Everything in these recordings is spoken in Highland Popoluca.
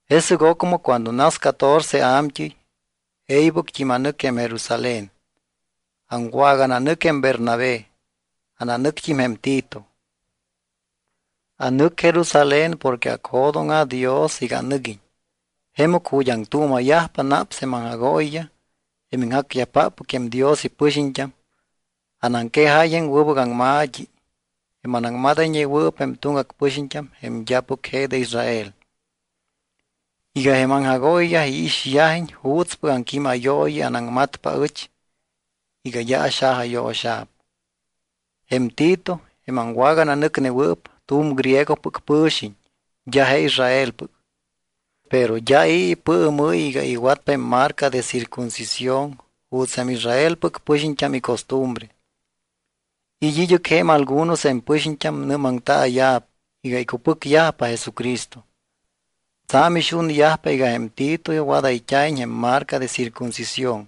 Jesɨc ocmɨ cuando nas catorce a̱mt́ɨy, e̱ybɨct́im anɨc jém Jerusalén. Aŋwagananɨc jém Bernabé. Ananɨct́im jém Tito. Anɨc Jerusalén porque acjo̱dóŋa̱ Dios iga anɨguiñ. Jemɨc ju̱t́ aŋtuuma̱yajpa naps jém aŋjagooyiyaj, jém iŋjacyajpáppɨc jém Dios ipɨxiñt́am, anaŋquejáy jém wɨbɨc aŋma̱t́i, jém anaŋmadayñewɨɨp jém tuŋgac pɨxiñt́am jém d́apɨc je de Israel, iga jém aŋjagooyiyaj iixyajiñ juutspɨc aŋquímayooyi anaŋmatpa aɨch iga d́a axajayo̱xa̱p. Jém Tito, jém aŋwagananɨcnewɨɨp, tu̱m griegopɨc pɨ̱xiñ d́a je Israelpɨc. Pero d́a i̱ ipɨɨmɨ́y iga iwatpa jém marca de circuncisión juuts jém Israelpɨc pɨxiñt́am icostumbre. It́ id́ɨc je̱m algunos jém pɨxiñt́am nɨ́maŋtaaya̱p iga icupɨcyajpa Jesucristo. Tsa̱m ixunyajpa iga jém Tito wadayt́a̱iñ jém marca de circuncisión.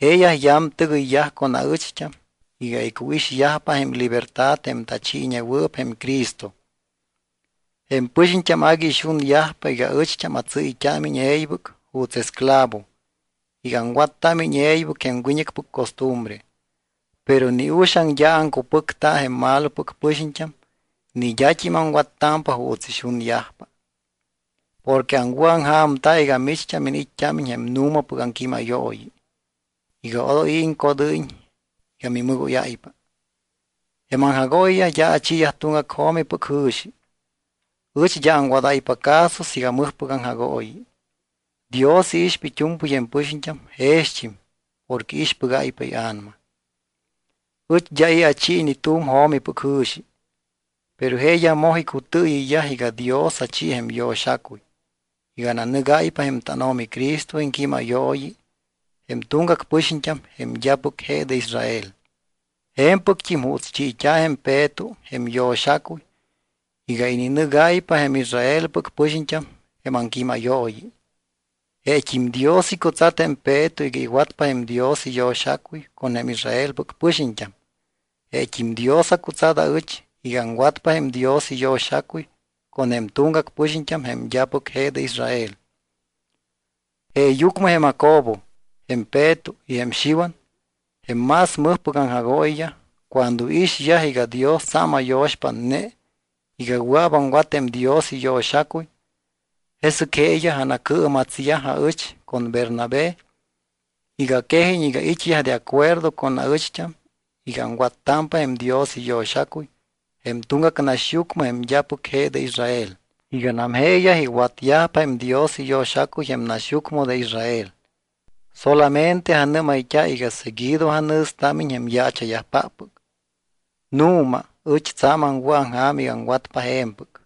Jeeyaj yamtɨgɨyyaj con aɨcht́am iga icuixyajpa jém libertad jém tachiiñewɨɨp jém Cristo. Jém pɨxiñt́am agui ixunyajpa iga ɨcht́am atsɨ́yt́ámiñ e̱ybɨc juuts esclavo iga aŋwattámiñ e̱ybɨc jém wiñɨcpɨc costumbre. Pero ni uxaŋ d́a aŋcupɨcta jém malopɨc pɨxiñt́am ni d́a aŋwattámpa juuts ixunyajpa, porque aŋwɨ̱aŋja̱mta iga micht́am iniit́t́ámiñ jém nu̱mapɨc aŋquímayooyi iga odoy i̱ iŋcodɨ́yiñ iga mimɨgóyáypa. Jém aŋjagooyiyaj d́a achiiyaj tuŋgac jo̱mipɨc jɨ̱xi. Ɨch d́a aŋwadáypa caso siiga mɨjpɨc aŋjagooyi. Dios iixpa it́u̱mpɨy jém pɨxiñt́am jext́im porque iixpɨgáypa ia̱nama. Ɨch d́a i̱ achi ni tu̱m jo̱mipɨc jɨ̱xi, pero jeeyaj moj icutɨɨyɨyyaj iga Dios achi jém yo̱xacuy iga ananɨgáypa jém tánO̱mi Cristo iŋquímayooyi jém tuŋgac pɨxiñt́am jém d́apɨc je de Israel, je̱mpɨct́im juuts chiit́a̱ jém Peto jém yo̱xacuy iga ininɨgáypa jém Israelpɨc pɨxiñt́am jém aŋquímayooyi. Jeet́im Dios icutsat jém Peto iga iwatpa jém Dios iyo̱xacuy con jém Israelpɨc pɨxiñt́am. Jeet́im Dios acutsat aɨch iga aŋwatpa jém Dios iyo̱xacuy con jém tuŋgac pɨxiñt́am jém d́apɨc je de Israel. Jeeyucmɨ jém Jacobo, jém Peto y jém Xiwan, jém más mɨjpɨc aŋjagooyiyaj, cuando iixyaj iga Dios tsa̱m ayo̱xpátne iga wɨa̱p aŋwat jém Dios iyo̱xacuy, jesɨc jeeyaj anacɨɨmatsyaj aɨch con Bernabé iga quejiñ iga it́yaj de acuerdo con aɨcht́am iga aŋwattámpa jém Dios iyo̱xacuy jém tuŋgac naxyucmɨ, jém d́apɨc je de Israel, iganam jeeyaj iwatyajpa jém Dios iyo̱xacuy jém naxyucmɨ de Israel. Solamente anɨ́mayt́a iga seguido anjɨ̱stámiñ jém yaacha̱yajpáppɨc. Nu̱ma ɨch tsa̱m aŋwɨ̱aŋja̱m iga aŋwatpa je̱mpɨc.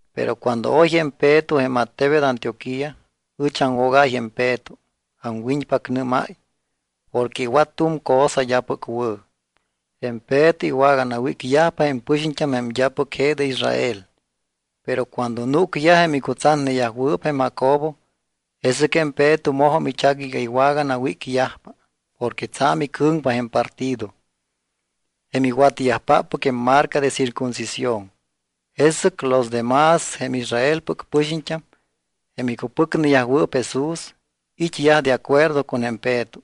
Pero cuando oy jém Peto jém attebet Antioquía, ɨch aŋwogáy jém Peto aŋwiñpacnɨ́máy porque iwat tu̱m cosa d́apɨc wɨ̱. Jém Peto iwaganawícyajpa jém pɨxiñt́am jém d́apɨc je de Israel. Pero cuando núcyaj jém icutsatneyajwɨɨp jém Jacobo, jesɨc jém Peto mojum ichac iga iwaganawícyajpa porque tsa̱m icɨ̱ŋpa jém partido, jém iwatyajpáppɨc jém marca de circuncisión. Jesɨc los de más jém Israelpɨc pɨxiñt́am, jém icupɨcneyajwɨɨp Jesús, it́yaj de acuerdo con jém Peto.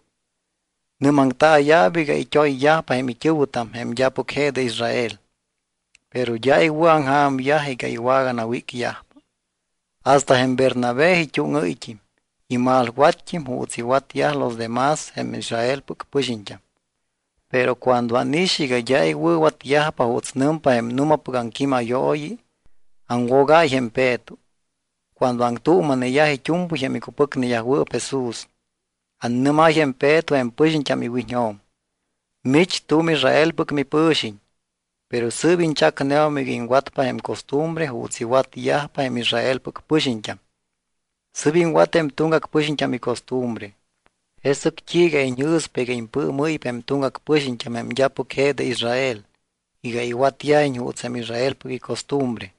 Nɨ́maŋtaaya̱p iga it́oyyajpa jém it́ɨ̱wɨtam jém d́apɨc je de Israel, pero d́a iwɨ̱aŋja̱myaj iga iwaganawícyajpa. Hasta jém Bernabé it́úŋɨ́yt́im, imalwatt́im juuts iwatyaj los de más jém Israelpɨc pɨxiñt́am. Pero cuando ánix iga d́a iwɨ̱watyajpa juuts nɨmpa jém nu̱mapɨc aŋquímayooyi, aŋwogáy jém Peto. Cuando aŋtuuma̱neyaj it́u̱mpɨy jém icupɨcneyajwɨɨp Jesús, annɨ́máy jém Peto jém pɨxiñt́am iwiñjo̱m: “Mich tu̱m Israelpɨc mipɨ̱xiñ, pero sɨɨp iñchacneum iga iŋwatpa jém costumbre juuts iwatyajpa jém Israelpɨc pɨxiñt́am. Sɨ́p iŋwat jém tuŋgac pɨxiñt́am icostumbre. ¿Jesɨc t́iiga iñjɨ̱spa iga impɨɨmɨ́ypa jém tuŋgac pɨxiñt́am, jém d́apɨc je de Israel, iga iwatyajiñ juuts jém Israelpɨc icostumbre?”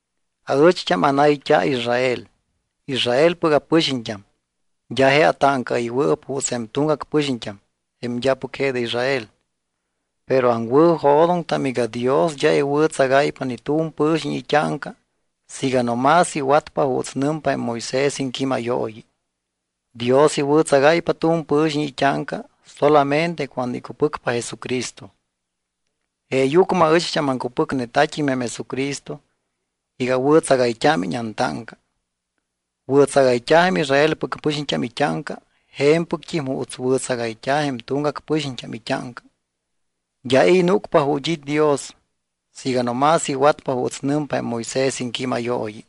Aɨcht́am anayt́a Israel. Israelpɨc apɨxiñt́am. D́a je atáŋcaɨywɨɨp juuts jém tuŋgac pɨxiñt́am, jém d́apɨc je de Israel. Pero aŋwɨ̱jo̱doŋtam iga Dios d́a iwɨ̱tsagáypa ni tu̱m pɨ̱xiñ it́áŋca siiga no más iwatpa juuts nɨmpa jém Moisés iŋquímayooyi. Dios iwɨ̱tsagáypa tu̱m pɨ̱xiñ it́áŋca solamente cuando icupɨcpa Jesucristo. Jeeyucmɨ aɨcht́am aŋcupɨcnetat́im jém Jesucristo iga awɨ̱tsagayt́ámiñ antáŋca. Wɨ̱tsagayt́a̱ jém Israelpɨc pɨxiñt́am it́áŋca je̱mpɨct́im juuts wɨ̱tsagayt́a̱ jém tuŋgac pɨxiñt́am it́áŋca. D́a i̱ núcpa ju̱t́ it́ Dios siiga no más iwatpa juuts nɨmpa jém Moisés iŋquímayooyi.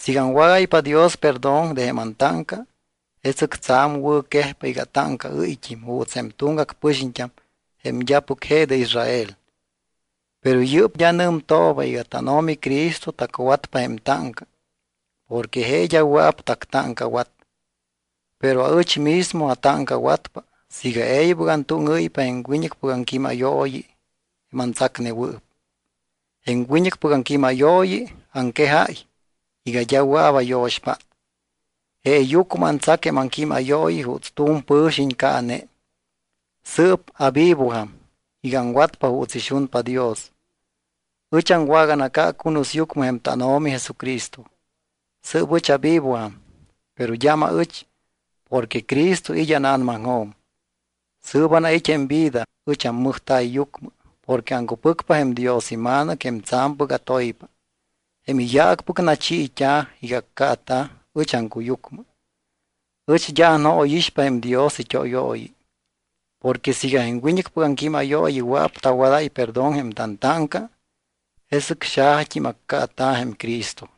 Siiga aŋwágáypa Dios perdón de jém antáŋca, jesɨc tsa̱m wɨ̱quejpa iga atáŋcaɨ́yt́im juuts jém tuŋgac pɨxiñt́am jém d́apɨc je de Israel. Pero yɨ́p d́a nɨmtooba iga tánO̱mi Cristo tacwatpa jém táŋca porque je d́a wɨa̱p tactáŋcawat. Pero aɨch mismo atáŋcawatpa siiga e̱ybɨc antúŋɨ́ypa jém wiñɨcpɨc aŋquímayooyi jém antsacnewɨɨp. Jém wiñɨcpɨc aŋquímayooyi aŋquejáy iga d́a wɨa̱p ayo̱xpát, jeeyucmɨ antsac jém aŋquímayooyi juuts tu̱m pɨ̱xiñ caane. Sɨɨp avivojam iga aŋwatpa juuts ixunpa Dios. Ɨch aŋwaganaca cunusyucmɨ jém tánO̱mi Jesucristo. Sɨɨp ɨch avivojam, pero d́am aɨch, porque Cristo it́ ána̱namaŋjo̱m. Sɨɨp anait́ jém vida, it́ ammɨjta̱yyucmɨ porque aŋcupɨcpa jém Dios iMa̱nɨc jém tsa̱mpɨc atoypa, jém iyaacpɨc nachiit́a̱ iga accaata̱ ɨch aŋcuyucmɨ. Ɨch d́a anjóyixpa jém Dios it́óyooyi. Porque siiga jém wiñɨcpɨc aŋquímayooyi wɨa̱p tawadáy perdón jém tantáŋca, jesɨc xajat́im accaata̱ jém Cristo.